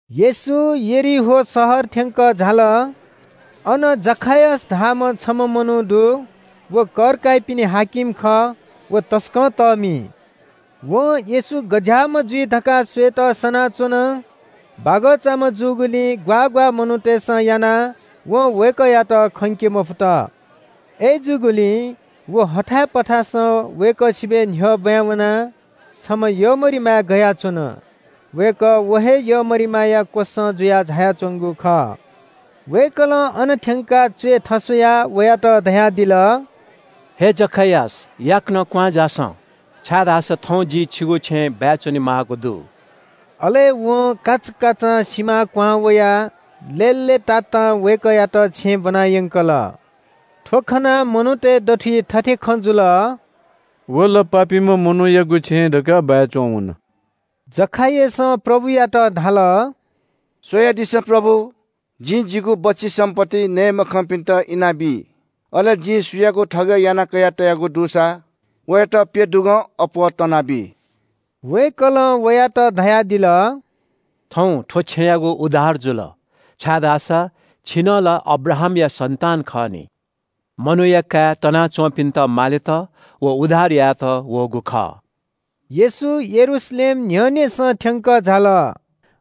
येशू यरीहो शहर थ्‍यंकः झाल। अन जखायस धाःम्‍ह छम्‍ह मनू दु। व कर काइपिनि हाकिम खः। व तसकं तःमि। वं येशू गज्‍याःम्‍ह जुइ धकाः स्‍वयेत सनाच्‍वन। बागःचाम्‍ह जूगुलिं ग्‍वाः ग्‍वाः मनूतय्‌सं यानाः वं वय्‌कःयात खंके मफुत। अय्‌जूगुलिं व हथाय् पथासं वय्‌कः स्‍वयाः न्‍ह्यः ब्‍वाँय् वनाः छमा यःमरिमाय् गयाच्‍वन। वय्‌कः व हे यःमरिमाया क्‍वसं जुयाः झायाच्‍वंगु खः। वय्‌कलं अन थ्‍यंकाः च्‍वय् थस्‍वयाः वयात धयादिल – “हे जखायस, याकनं क्‍वहां झासँ, छाय्‌धाःसा थौं जि छिगु छेँय् बाय् च्‍वनेमाःगु दु।” अले वं काचाकाचां सिमां क्‍वहां वयाः लय्‌लय्‌तातां वय्‌कःयात छेँय् ब्‍वनायंकल। थ्‍व खनाः मनूतय् दथुइ थथे खँ जुल – “व ला पापीम्‍ह मनूयागु छेँय् धकाः बाय् च्‍वंवन।” जखायसं प्रभुयात धाल – “स्‍वयादिसँ प्रभु, जिं जिगु बच्‍छि सम्‍पत्ति नये मखंपिन्‍त इनाबी। अले जिं सुयागुं थगय् यानाः कयातयागु दुसा, वयात प्‍यदुगं अप्‍वः तनाबी।” वय्‌कलं वयात धयादिल – “थौं थ्‍व छेँयागु उद्धार जुल, छाय्‌धाःसा छि नं ला अब्राहामया सन्‍तान खः नि। मनूया काय् तनाच्‍वंपिन्‍त मालेत व उद्धार यायेत वःगु खः।” येशू यरूशलेम न्‍ह्यःनेसं थ्‍यंकः झाल।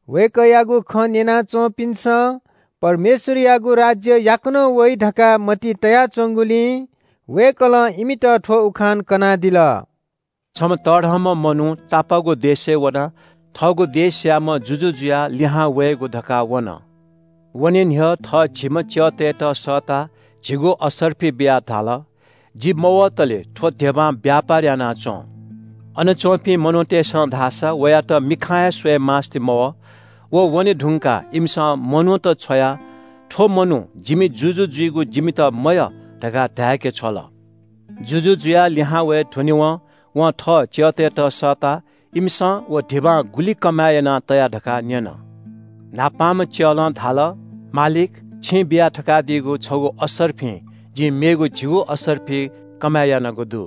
वय्‌कःयागु खँ न्‍यना च्‍वंपिन्‍सं परमेश्‍वरयागु राज्‍य याकनं वइ धकाः मतिइ तया च्‍वंगुलिं वय्‌कलं इमित थ्‍व उखान कनादिल। “छम्‍ह तःधंम्‍ह मनू तापाःगु देशय् वनाः थःगु देशयाम्‍ह जुजु जुयाः लिहां वयेगु धकाः वन। वने न्‍ह्यः थः झिम्‍ह च्‍यःतय्‌त सःताः झिगू असर्फि बियाः धाल – ‘जि मवतले थ्‍व धिबां व्‍यापार याना च्‍वँ।’ अन च्‍वंपिं मनूतय्‌सं धाःसा वयात मिखां हे स्‍वयेमास्‍ति मवः। व वने धुंकाः इमिसं मनूत छ्वयाः ‘थ्‍व मनू जिमि जुजु जुइगु जिमित मयः’ धकाः धाय्‌के छ्वल। “जुजु जुयाः लिहां वये धुनेवं वं थः च्‍यःतय्‌त सःताः इमिसं व धिबां गुलि कमय् यानाः तया धकाः न्‍यन। न्‍हापांम्‍ह च्‍यलं धाल – ‘मालिक, छिं बिया थकादीगु छगू असर्फिं जिं मेगु झिगू असर्फि कमय् यानागु दु।’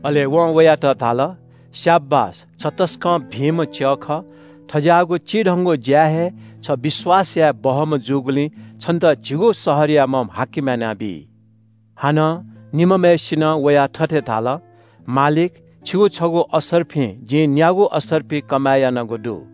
“अले वं वयात धाल – ‘स्‍याबास, छ तसकं भिंम्‍ह च्‍यः खः। थज्‍याःगु चिधंगु ज्‍याय् हे छ विश्‍वास याये बहःम्‍ह जूगुलिं छन्‍त झिगू शहरयाम्‍ह हाकिम यानाबी।’ “हानं निम्‍हम्‍हय्‌सिनं वयाः थथे धाल – ‘मालिक, छिगु छगू असर्फिं जिं न्‍यागू असर्फि कमय् यानागु दु।’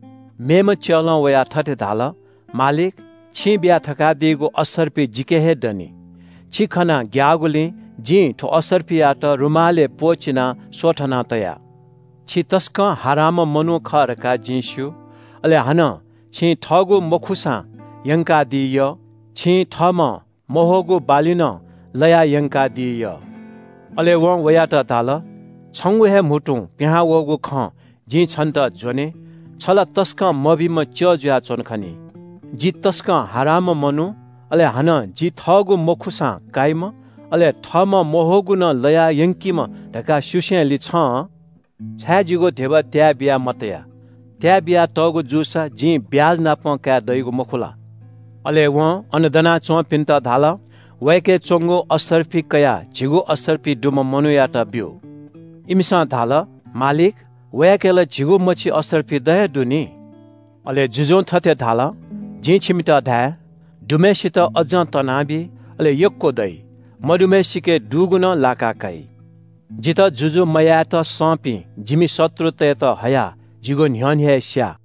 “मेम्‍ह च्‍यलं वयाः थथे धाल – ‘मालिक, छिं बिया थकादीगु असर्फि जिके हे दनि। छि खनाः ग्‍याःगुलिं जिं थ्‍व असर्फियात रुमालय् प्‍वःचिनाः स्‍वथना तया। छि तसकं हारांम्‍ह मनू खः धकाः जिं स्‍यू, अले हानं छिं थःगु मखुसां यंकादी यः। छिं थःम्‍हं मह्वःगु बाली नं लयाः यंकादी यः।’ “अले वं वयात धाल – ‘छंगु हे म्‍हुतुं पिहां वःगु खं जिं छन्‍त ज्‍वने, छ ला तसकं मभिंम्‍ह च्‍यः जुयाच्‍वन खनी। जि तसकं हारांम्‍ह मनू, अले हानं जि थःगु मखुसां काइम्‍ह, अले थःम्‍हं मह्वःगु नं लयाः यंकीम्‍ह धकाः स्‍यूसेलिं छं छाय् जिगु धिबा त्‍याय् बिया मतया? त्‍याय् बियातःगु जूसा जिं ब्‍याजनापं काये दइगु मखु ला?’ “अले वं अन दनाच्‍वंपिन्‍त धाल – ‘वयाके च्‍वंगु असर्फि कयाः झिगू असर्फि दुम्‍ह मनूयात ब्‍यु।’ “इमिसं धाल – ‘मालिक, वयाके ला झिगू मछि असर्फि द हे दु नि।’ “अले जुजुं थथे धाल – जिं छिमित धाये – ‘दुम्‍हय्‌सित अज्‍जं तनाबी, अले यक्‍व दइ। मदुम्‍हय्‌सिके दुगु नं लाका काइ। जितः जुजु मयायेत संपिं जिमि शत्रुतय्‌त हयाः जिगु न्‍ह्यःने हे स्‍या।’”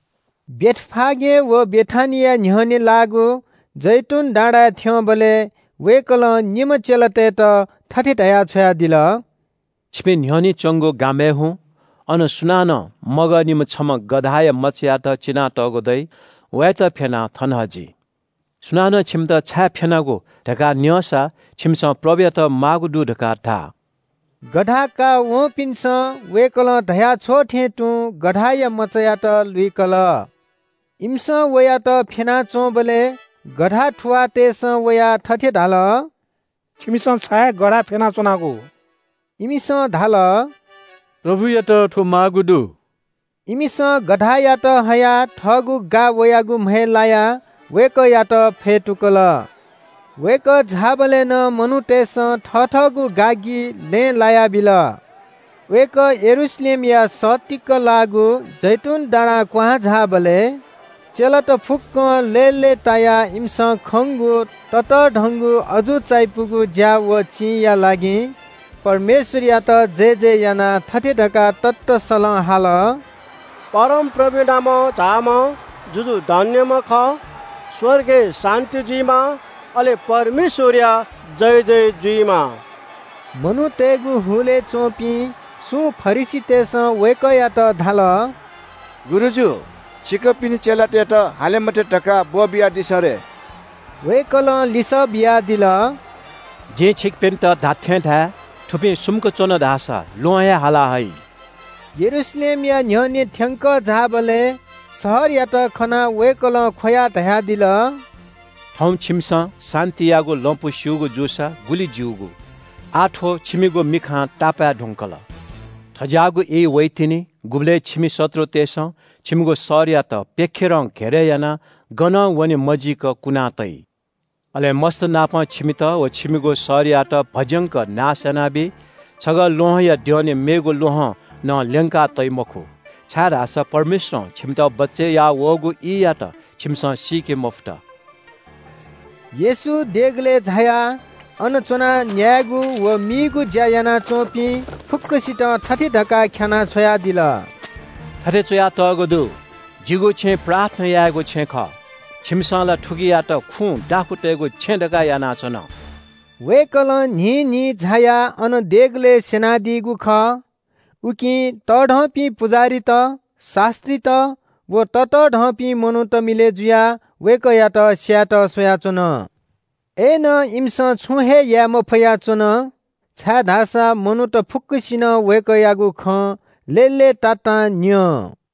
बेथफागे व बेथानिया न्‍ह्यःने लाःगु जैतून डाँडाय् थ्‍यंबलय् वय्‌कलं निम्‍ह चेलातय्‌त थथे धयाः छ्वयादिल – “छिपिं न्‍ह्यःने च्‍वंगु गामय् हुँ। अन सुनानं मगःनिम्‍ह छम्‍ह गधाया मचायात चिनातःगु दइ। वयात फ्‍यनाः थन हजि। सुनानं छिमित ‘छाय् फ्‍यनागु?’ धकाः न्‍यंसा छिमिसं ‘प्रभुयात माःगु दु’ धकाः धा।” गधा काःवंपिन्‍सं वय्‌कलं धया छ्वःथें तुं गधाया मचायात लुइकल। इमिसं वयात फ्‍यना च्‍वंबलय् गधा थुवाःतय्‌सं वयाः थथे धाल – “छिमिसं छाय् गधा फ्‍यनाच्‍वनागु?” इमिसं धाल – “प्रभुयात थ्‍व माःगु दु।” इमिसं गधायात हयाः थःगु गा वयागु म्‍हय् लायाः वय्‌कःयात फ्‍यतुकल। वय्‌कः झाःबलय् नं मनूतय्‌सं थथःगु गागि लँय् लायाबिल। वय्‌कः यरूशलेमया सत्तीक लाःगु जैतून डाँडां क्‍वहां झाःबलय् चेलात फुक्‍कं लय्‌लय्‌तायाः इमिसं खंगु ततःधंगु अजू चायापुगु ज्‍या व चिंया लागि परमेश्‍वरयात जयजय यानाः थथे धकाः ततःसलं हाल – “परमप्रभुया नामं झाःम्‍ह जुजु धन्‍यम्‍ह खः। स्‍वर्गय् शान्‍ति जुइमा, अले परमेश्‍वरया जयजय जुइमा।” मनूतय्‌गु हुलय् च्‍वंपिं सुं फरिसीतय्‌सं वय्‌कःयात धाल – “गुरुजु, छिकपिनि चेलातय्‌त हाले मते धकाः ब्‍वःबियादिसँ रे।” वय्‌कलं लिसः बियादिल – “जिं छिकपिन्‍त धात्‍थें धाये – थुपिं सुम्‍क च्‍वन धाःसा ल्‍वहं हे हाला हइ।” यरूशलेमया न्‍ह्यःने थ्‍यंकः झाःबलय् शहरयात खनाः वय्‌कलं ख्‍वयाः धयादिल – “थौं छिमिसं शान्‍तियागु लँपु स्‍यूगु जूसा गुलि ज्‍यूगु। आः थ्‍व छिमिगु मिखां तापाय् धुंकल। थज्‍याःगु ई वइतिनि गुबलय् छिमि शत्रुतय्‌सं छिमिगु शहरयात प्‍यखेरं घेरय् यानाः गनं वने मजीक कुना तइ। अले मस्‍तनापं छिमित व छिमिगु शहरयात भज्‍यंक नाश यानाबी। छगः ल्‍वहंया द्यःने मेगु ल्‍वहं नं ल्‍यंका तइ मखु, छाय्‌धाःसा परमेश्‍वरं छिमित बचय् याः वःगु ईयात छिमिसं सीके मफुत।” येशू देगलय् झायाः अन च्‍वनाः न्‍यायेगु व मीगु ज्‍या यानाच्‍वंपिं फुक्‍कसितं थथे धकाः ख्‍यानाः छ्वयादिल – “थथे च्‍वयातःगु दु – ‘जिगु छेँ प्रार्थना यायेगु छेँ खः।’ छिमिसं ला थुकियात खुँ दाखुँतय्‌गु छेँ धकाः यानाच्‍वन।” वय्‌कलं न्‍हिन्‍हिं झायाः अन देगलय् स्‍यनादीगु खः। उकिं तःधंपिं पुजाहारीत, शास्‍त्रीत व ततःधंपिं मनूत मिलय् जुयाः वय्‌कःयात स्‍यायेत स्‍वयाच्‍वन। अय्‌नं इमिसं छुं हे याये मफया च्‍वन, छाय्‌धाःसा मनूत फुक्‍कसिनं वय्‌कःयागु खँ लय्‌लय्‌तातां न्‍यं।